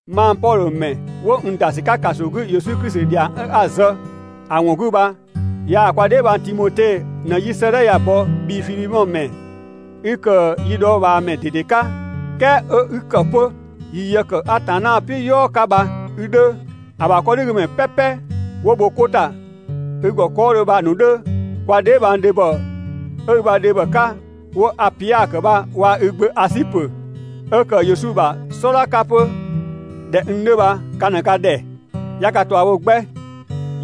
Mang Pɔdhö ‑mɛ 'wo n ‑da ‑sü 'ka ‑kaso 'gü Yesu Klisi ‑dhiang 'a‑ zë ꞊në‑ ‑wɔn 'gü bha yaa‑ kwa dheebhang Timote ꞊në 'yi 'sëëdhɛ ya‑ bɔ bhii Fidhemɔ ‑mɛ 'i ‑kë yi dhɔɔbhaamɛ ꞊dede 'ka, "kɛɛ 'ö 'i ‑kë 'pö yi yë ‑kë Atanna "piʋ̈ "yɔɔ 'ka bha i 'dhö, ‑A ‑bha 'kɔdhigümɛ "pɛpɛ 'wo bho 'ko ‑ta i ‑gɔ 'kɔɔdhö bha‑ ‑nu 'dhö, kwa dheebhang dhebhɔ 'ö i ‑bha dhebhɔ 'ka 'wo‑ Apia ‑kë bha waa‑ i gbö Asipö 'ö ‑kë Yesu ‑bha "sɔdha 'ka 'pö ꞊dhɛ n 'dhö bha ka ꞊në ka ‑dhɛ, 'ya ka ꞊tua bho 'gbɛ.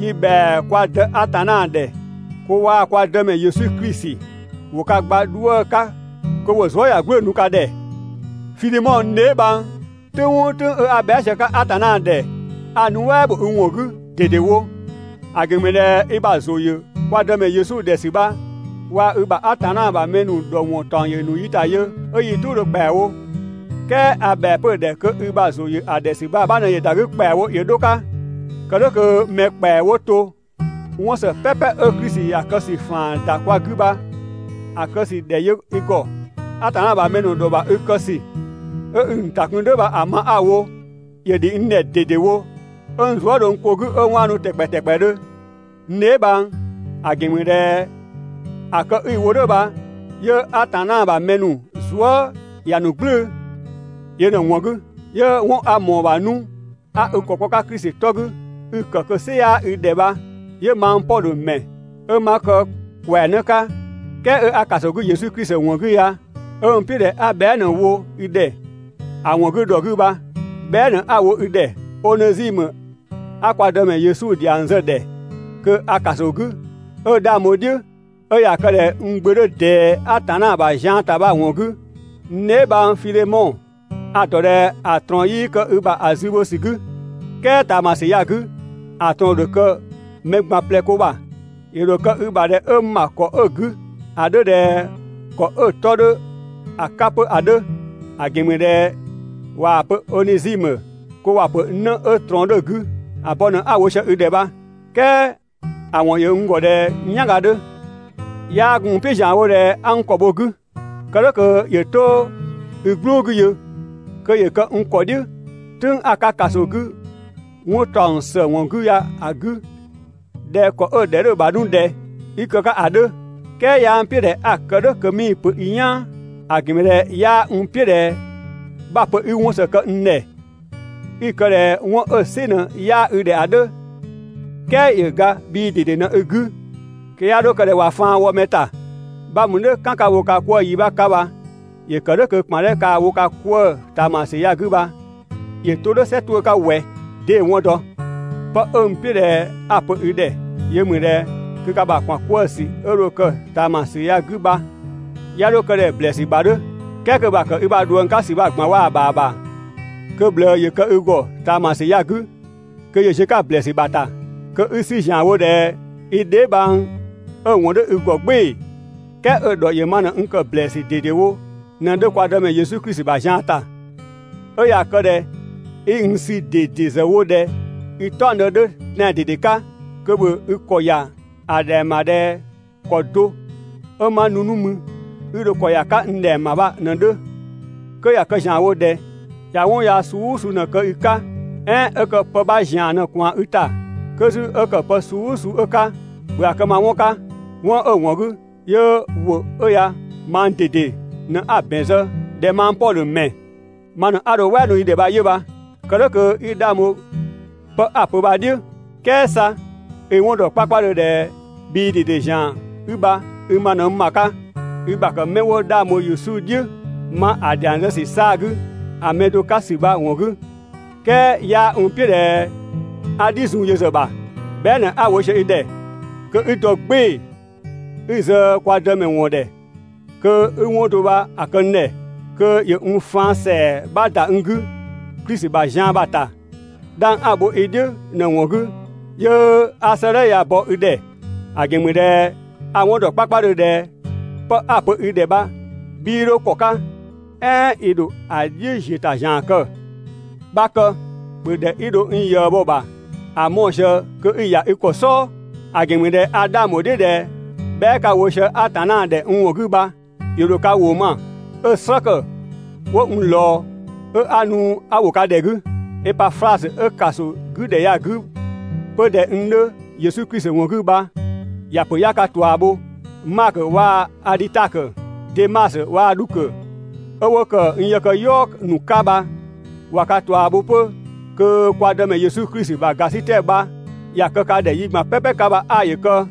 Yi ‑bhɛa kwa Dë Atanna ‑dhɛ kö waa‑ kwa Dëmɛ Yesu Klisi ‑wo ka gba 'dhuë‑ 'ka kö ‑wo zuëyagblʋ̈ʋ̈‑ nu ka ‑dhɛ. Fidhemɔ n dheebhang, "tʋ̈ng "ʋʋ "tʋ̈ng 'a bhɛa" sië‑ 'ka Atanna ‑dhɛ, a‑ nuɛ" ‑bho i ‑wɔn 'gü ꞊dedewo. ‑A ‑gɛn ‑mü ꞊dhɛ i ‑bha ‑zʋ ‑yö kwa Dëmɛ Yesu ‑dhɛ ‑sü bha waa‑ i ‑bha Atanna ‑bha mɛ ‑nu ‑dhɔ ‑wɔn ‑taɔng ‑yö ‑nu yi ‑ta yö ‑kpɛawo, 'ö yi "tʋʋdhö ‑kpɛawo. "Kɛɛ a ‑bhɛa 'pö‑ ‑dhɛ kö i ‑bha ‑zʋ ‑yö ‑a ‑dhɛ ‑sü bha‑ 'bha ꞊në ‑yö ‑da 'gü ‑kpɛawo ‑yö 'dho‑ 'ka, kë "dhʋ̈ kö mɛ ‑kpɛa 'wo to ‑wo 'wɔn ‑së "pɛpɛ 'ö Klisi ‑ya kë ‑sü ‑faan ‑da kwa 'gü bha‑ kë ‑sü ‑dhɛ yö i ‑gɔ. Atanna ‑bha mɛ ‑nu ‑dhɔ ‑bha i kë ‑sü 'ö 'i‑ ‑nu ‑ta kun "dhʋ̈ bha‑ ma 'a‑ wo, ‑yö ‑dhi n ‑dhɛ ꞊dedewo 'ö n zuë" dho n ko 'gü 'ö 'waanu ‑tɛkpɛ ‑tɛkpɛdhö, n dheebhang, ‑a ‑gɛn ‑mü ꞊dhɛ ‑a kë 'i‑ wo "dhʋ̈ bha 'yö Atanna ‑bha mɛ ‑nu zuë" ‑ya ‑a ‑nu "gblʋ̈ʋ̈‑. Yö ꞊në‑ ‑wɔn 'gü 'yö 'wɔn 'a ꞊mɔɔ‑ ‑bha 'nu 'a i ‑kɔ kpɔ‑ 'ka Klisi 'tɔ 'gü 'i‑ ‑kë kö‑ "sɩ 'yaa i ‑dhɛ bha, 'yö mang Pɔdhö ‑mɛ 'ö 'ma kë ‑kwɛanë 'ka "kɛɛ 'ö 'a ‑kaso 'gü Yesu Klisi ‑wɔn 'gü ya 'ö n "piʋ̈ ꞊dhɛ 'a ꞊bhɛa ꞊në‑ wo i ‑dhɛ ‑a ‑wɔn 'gü ‑dhɔ 'gü bha. Bhɛa" ꞊në 'a‑ wo i ‑dhɛ Onezimö 'a kwa Dëmɛ Yesu ‑dhiang zë‑ ‑dhɛ kö a ‑kaso 'gü 'ö 'dhang bho‑ "dhiʋ̈, 'ö ꞊ya kë ꞊dhɛ n gbö 'dhö ꞊dɛɛ Atanna ‑bha zian ‑ta bha‑ ‑wɔn 'gü, n dheebhang Fidhemɔ. A‑ ‑dɔ ꞊dhɛ ‑a ꞊trɔɔn 'yii kë i ‑bha ‑a zü bho ‑sü 'gü, "kɛɛ ꞊taamasü ya‑ 'gü ‑a ꞊trɔɔn ‑dho kë mɛ ꞊gban ꞊plɛ ko ‑bha. ‑Yö ‑dho kë i ‑bha ꞊dhɛ 'ö n ‑bha ‑kɔ 'ö‑ 'gü ‑a 'dhö ꞊dhɛ ‑kɔ 'ö‑ 'tɔ 'dhö‑ 'ka 'pö ‑a 'dhö, ‑a ‑gɛn ‑mü ꞊dhɛ ꞊waa‑ pö Onezimö kö ‑wa pö 'në 'ö ꞊trɔɔn 'dhö‑ 'gü. ‑A bɔ ꞊në 'a‑ wo sië i ‑dhɛ bha, "kɛɛ ‑a ‑wɔn ‑yö n ‑gɔ ꞊dhɛ n "yanga 'dhö. 'Yaa gun n "piʋ̈ ‑zianwo ꞊dhɛ 'a n ‑kɔ bho‑ 'gü, kë "dhʋ̈ kö ‑yö 'to i "gblʋʋ 'gü yö, kö ‑yö kë n ‑kɔ "dhiʋ̈ "tʋ̈ng 'a‑ 'ka ‑kaso 'gü 'wɔn ‑taɔng ‑së ‑wɔn 'gü ya‑ 'gü ꞊dhɛ ‑kɔ 'ö‑ ‑dhɛ 'dhö‑ ‑bha 'nu ꞊dhɛ 'i kë‑ 'ka ‑a 'dhö. "Kɛɛ 'yaa n "piʋ̈ ꞊dhɛ a‑ ‑kë "dhʋ̈ kö 'mii‑ pö i "yaan. ‑A ‑gɛn ‑mü ꞊dhɛ 'yaa n "piʋ̈ ꞊dhɛ 'bha‑ pö 'i 'wɔn ‑së kë n ‑dhɛ, 'i‑ kë ꞊dhɛ 'wɔn 'ö‑ "sɩ ꞊në 'yaa i ‑dhɛ ‑a 'dhö, "kɛɛ ‑yö ga bhii ꞊dede ꞊në i 'gü, kö 'ya 'dho kë ꞊dhɛ ꞊wa faan wɔ mɛ ‑ta. 'Bha mü "dhʋ̈ "kan 'ka‑ wo ka 'kwëë‑ yi 'bha 'ka bha ‑yö ‑kë "dhʋ̈ kö ‑kpan 'dhɛ kaa‑ wo ka 'kwëë‑ ꞊taamasü ya‑ 'gü bha ‑yö 'to "dhʋ̈ "sɛ 'tuʋ̈‑ 'ka ꞊wɛ, 'dee‑ 'wɔn dɔ? 'Pë 'ö n "piʋ̈ ꞊dhɛ 'a‑ pö i ‑dhɛ yö ‑mü ꞊dhɛ kö ka ‑bha ‑kpan 'kwëë‑ ‑sü 'dhɛ 'ö dho kë ꞊taamasü ya‑ 'gü bha 'ya 'dho kë ꞊dhɛ ‑blɛɛsü ‑bha 'dhö, "kɛɛ kö‑ ‑bha ‑kë i ‑bha ꞊dhuëng 'ka ‑sü ꞊gban waa‑ ‑bha ‑bha, kö‑ ꞊bhlëë ‑yö kë i ‑gɔ ꞊taamasü ya‑ 'gü kö ‑yö ziö‑ 'ka ‑blɛɛsü ‑bha ‑ta, kö 'i‑ 'sü ‑zianwo ꞊dhɛ i dheebhang 'ö‑ ‑wɔn 'dhö i ‑gɔ "gbɩɩ‑, "kɛɛ 'ö‑ ‑dhɔ ‑yö ma ꞊në n ‑kë ‑blɛɛsü ꞊dedewo ꞊në‑ 'dhö kwa Dëmɛ Yesu Klisi ‑bha zian ‑ta. 'Ö ꞊ya kë ꞊dhɛ 'i n sü ꞊dede ‑zë wo ꞊dhɛ i "taɔngdë 'dhö tɛan‑ ꞊dede 'ka, kö ‑bhö i ‑kɔ ‑ya ‑a ‑dhɛng ‑bha ꞊dhɛ ‑kɔ do 'ö 'ma nu 'nu mü 'i dho ‑kɔ ‑ya 'ka n ‑dhɛng ‑bha bha ꞊në‑ 'dhö. 'Kö ꞊ya kë ‑zianwo ꞊dhɛ ꞊ya 'wɔn yaa suu "ʋʋ suu 'ö ꞊në‑ kë i 'ka, "ɛɛn 'ö kë pë 'bha ‑zian ꞊në ꞊kwaan i ‑ta, 'kö 'zü 'ö ‑kë pë suu "ʋʋ suu 'ö‑ 'ka, ‑bhö ‑a kë ma 'wɔn 'ka. 'Wɔn 'ö‑ ‑wɔn 'gü 'yö ‑wʋ 'ö ya mang ꞊dede ꞊në 'a‑ ‑bɛn zë ꞊dhɛ mang Pɔdhö ‑mɛ ma ꞊në 'a dho‑ "wɛɛ nu i ‑dhɛ bha 'yö bha. Kë "dhʋ̈ kö 'i 'dhang bho 'pë 'a‑ pö bha‑ "dhiʋ̈. ("Kɛɛ 'sa i‑ 'wɔn ‑dɔ 'kpakpadhö ꞊dhɛ bhii ꞊dede ‑zian 'i bha, i ma ꞊në n ‑bha 'ka i ‑bha ‑kë 'mɛ 'wo 'dhang bho Yesu "dhiʋ̈ ma ‑a ‑dhiang zë ‑sü 'saa‑ 'gü ‑a mɛ do 'ka ‑sü bha‑ ‑wɔn 'gü, "kɛɛ 'yaa n "piʋ̈ ꞊dhɛ 'a "dhi zun yö ‑zë ‑bha.) Bhɛa" ꞊në 'a‑ wo sië i ‑dhɛ kö 'i dɔ "gbɩɩ‑ i zë kwa Dëmɛ ‑wɔn ‑dhɛ kö 'i 'wɔn do bha‑ kë n ‑dhɛ, kö ‑yö n faan ‑sɛa 'bha ‑da n 'gü Klisi ‑bha zian bha‑ ‑ta. 'Dhang 'a‑ bho i "dhiʋ̈ ꞊në‑ ‑wɔn 'gü, 'yö 'a 'sëëdhɛ ya‑ bɔ i ‑dhɛ, ‑a ‑gɛn ‑mü ꞊dhɛ a‑ 'wɔn ‑dɔ 'kpakpadhö ꞊dhɛ 'pë 'a‑ pö i ‑dhɛ bha 'bhii 'dho ‑kɔ 'ka, "ɛɛn i ‑dho ‑a "dhiʋ̈ ‑ziö ‑ta ‑zian kë. 'Bha kë, ‑bhö ‑dhɛ 'i dho n ꞊yëë bho‑ ‑bha ‑a mɔɔ‑ ꞊sië kö 'i‑ ‑ya i ‑kɔ "sɔɔ, ‑a ‑gɛn ‑mü ꞊dhɛ a 'dhang ‑bho "dhiʋ̈ ꞊dhɛ bhɛa" 'ka‑ wo sië Atanna ‑dhɛ n ‑wɔn 'gü bha ‑yö ‑dho ka ‑wʋ ma 'ö‑ "slë ‑kë 'ö 'wo n ꞊lɔɔ, 'ö 'a nu 'a ‑wo ka ‑dhɛ 'gü. Epaflasö 'ö ‑kaso 'gü ‑dhɛ ya‑ 'gü 'pö ꞊dhɛ n 'dhö Yesu Klisi ‑wɔn 'gü bha ‑ya ‑pö 'ya ka ꞊tua bho. Makö waa‑ Adhitakö, Demasö waa‑ Dhukö 'ö 'wo ‑kë n yëkëyɔɔ ‑nu 'ka bha ꞊wa ka ꞊tua bho 'pö. Kö kwa Dëmɛ Yesu Klisi ‑bha ‑gasitɛ bha ‑ya kë ka ‑dhɛ yi ꞊gban "pɛpɛ 'ka bha 'aa ‑yö kë!